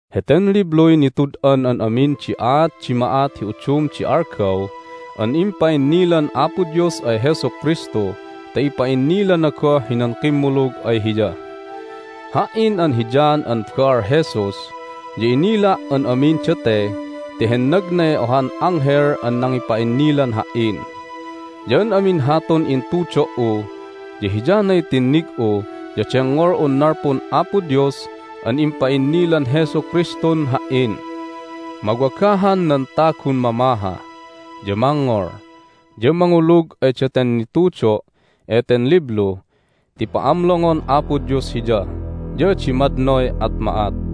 Heten libluy nitud'an an amin di aat di ma'at hi udum di algaw an impa'innilan Apo Dios ay Jesu Kristu ta ipa'innilana goh hinan kimmulug ay Hiya. Ha"in an hi John an baal Jesus ya inila' an amin date ti hennagnay ohan anghel an nangipa'innilan ha"in. Ya an amin hatun intudo"u ya hiyanay tinnig'u ya dengngol'un nalpun Apo Dios an impa'innilan Jesu Kristun ha"in. Mawagahan nan tagun mamaha, ya mangngol, ya mangulug ay daten nitudo' eten liblu ti pa'amlongon Apo Dios hiya, ya adi madnoy at ma'at.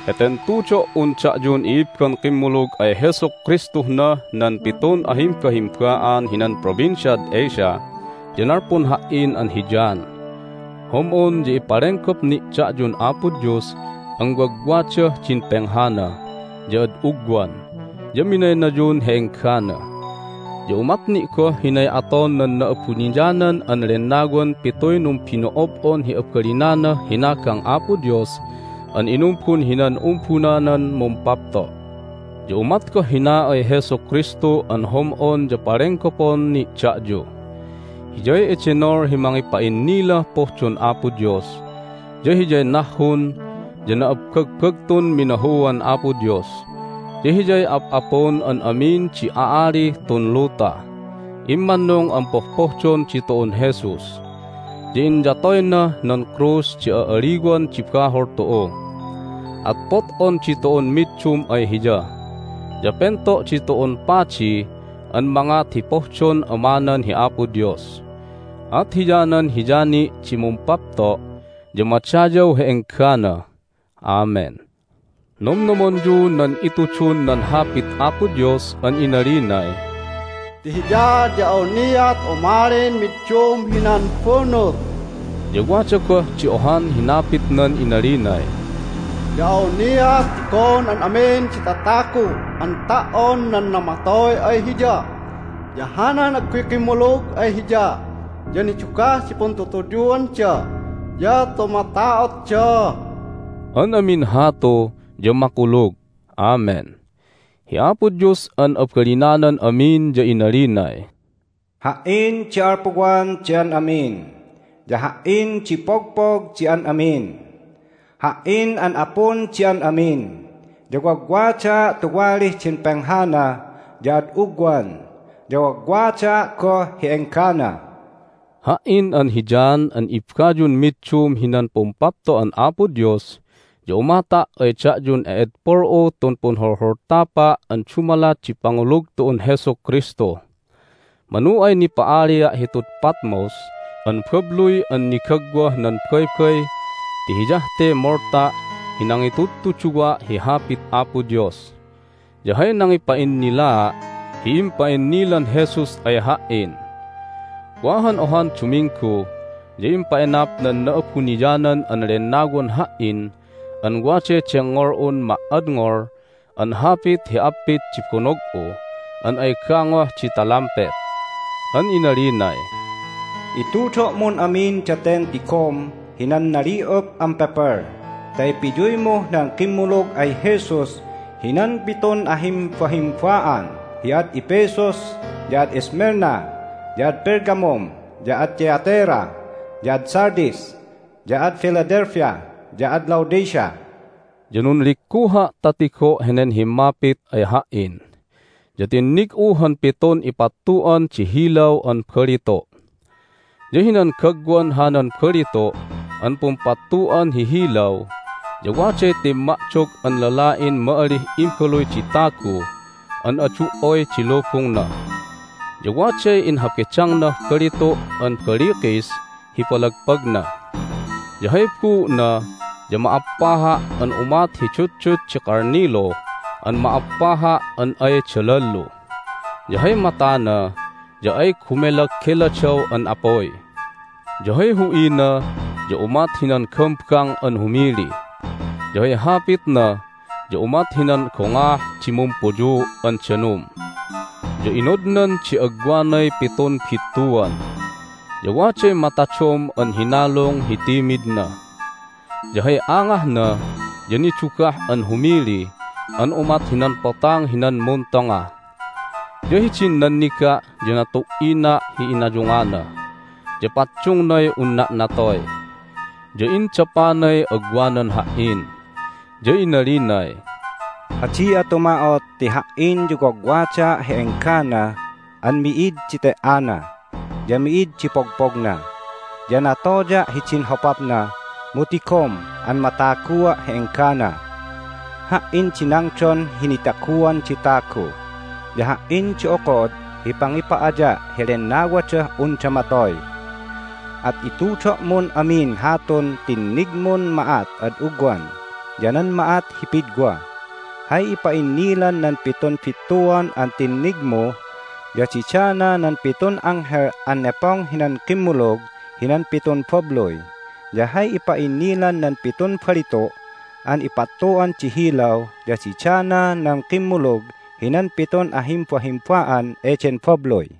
Heten tudo"un da'yun i'ibban kimmulug ay Jesu Kristuh nah nan pitun ahimbahimba'an hinan Provinciad Asia ya nalpun ha"in an hi John. Hom'on ya ipalenggop ni' da'yun Apo Dios an wagwadah din penghana, ya ad ugwan, ya minaynayun hi enggana. Ya umat ni' goh hinay aton nan Na'abuniyanan an Lennawan pituy numbino'ob'on hi abalinanah hinagang Apo Dios an inumbun hinan umbunanan mumpapto'. Ya umat goh hina ay Jesu Kristu an hom'on ya palenggopon ni' da'yu. Hiyay edenol hi mangipa'innilah pohdon Apo Dios, ya Hiyay nahhun ya na'abbagbagtun minahuan Apo Dios, ya Hiyay Ap'apun an amin di a'alih tun luta. Immannung an pohpohdon ditu'un Jesus, ya inyatoynah nan krus di a'aliwan di bahol tu'u. At pot'on ditu'un middum ay Hiya, ya pento' ditu'un padi an mangat hi pohdon Amanan hi Apo Dios. At hiyanan Hiya ni' di mumpapto' ya madayaw hi enggana. Amen! Nomnomonyu nan itudun nan Hapit Apo Dios an inalinay, "Ti Hiya ya awniat umalin middum hinan bunut." Ya wada goh di ohan hinapitnan inalinay, "Ya awniat tigon an amin di tatagu an ta"on nan namatoy ay Hiya, ya hanan agguy kimmulug ay Hiya ya nidugah di puntutuyuanda ya tumata'otda." An amin hatu ya makulug! Amen. Hi Apo Dios an abalinanan amin ya inalinay, "Ha"in di alpuwan di an amin, ya Ha"in di pogpog di an amin. Ha"in an Apun di an amin, ya wagwadaa' tuwalih din penghana ya ad ugwan, ya wagwadaa' goh hi enggana." Ha"in an hi John an ibbayun middum hinan pumpapto'an Apo Dios ya umata' ay da'yun e'edpol'u tun punholholtapa' an dumalat di pangulug tu'un Jesu Kristu. Manu ay nipa'alia' hitud Patmos an babluy an nigagwah nan baybay ti hiyah te molta' hi nangitudtuduwa' hi Hapit Apo Dios, ya hay nangipa'innilaa' hi impa'innilan Jesus ay ha"in. Wa han ohan Duminggu ya impa'enap nan Na'abuniyanan an Lennawan ha"in an waday dengngol'un ma"adngol an hapit hi appit di bonog'u an ay gangoh di talampet. An inalinay, "Itudo'mun amin daten tigom hinan nali'up an pepel ta ipiyuymuh nan kimmulug ay Jesus hinan pitun ahimbahimba'an hi ad Ephesus, ya ad Smyrna, ya ad Pergamum, ya ad Thyatira, ya ad Sardis, ya ad Philadelphia, ya ad Laodicea." Ya nunligguha' ta tigo' henen himmapit ay ha"in, ya tinnig'u han pitun ipattu'an di hilaw an balitu'. Ya hinan gagwan hanan balitu' an pumpattu'an hi hilaw ya waday timma'dog an lala'in ma'alih Imbaluy di Tagu an adu"oy di lubungna, ya waday inhabedangnah balitu' an balikis hi palagpagna. Ya hay buu'na ya ma'appaha' an umat hi dutdut di kalnilu an ma'appaha' an ay dalallu, ya hay matana ya ay gumelageladaw an apuy. Ya hay hu'ina ya umat hinan gambang an humili, ya hay hapitna ya umat hinan gongaah di mumpuyuu' an danum. Ya inodnan di agwanay pitun bittuan, ya waday matadom an hinalung hi timidna. Ya hay angahna ya nidugah an humili an umat hinan potang hinan muntonga. Ya hidin nanniga' ya natu"ina' hi inayungana, ya paddungnay unna' natoy. Ya indapanay agwanan ha"in, ya inalinay, "Adi'a tuma'ot ti Ha"in ya wagwadaa' hi enggana an mi'id di te"ana, ya mi'id di pogpogna. Ya natoya' hidin hopapna, mu tigom an matagua' hi enggana! Ha"in di nangdon hi nitaguan di tagu, ya Ha"in di okod hi pangipa'aya' hi lennawadah unda matoy. At itudo'mun amin hatun tinnigmun ma'at ad ugwan, ya nan ma'at hi pidwa. Hay ipa'innilan nan pitun bittuan an tinnigmu ya didana nan pitun anghel an nepong hinan kimmulug hinan pitun babluy. Ya hay ipa'innilan nan pitun balitu' an ipattu'an di hilaw ya didana nan kimmulug hinan pitun ahimbahimba'an eden babluy."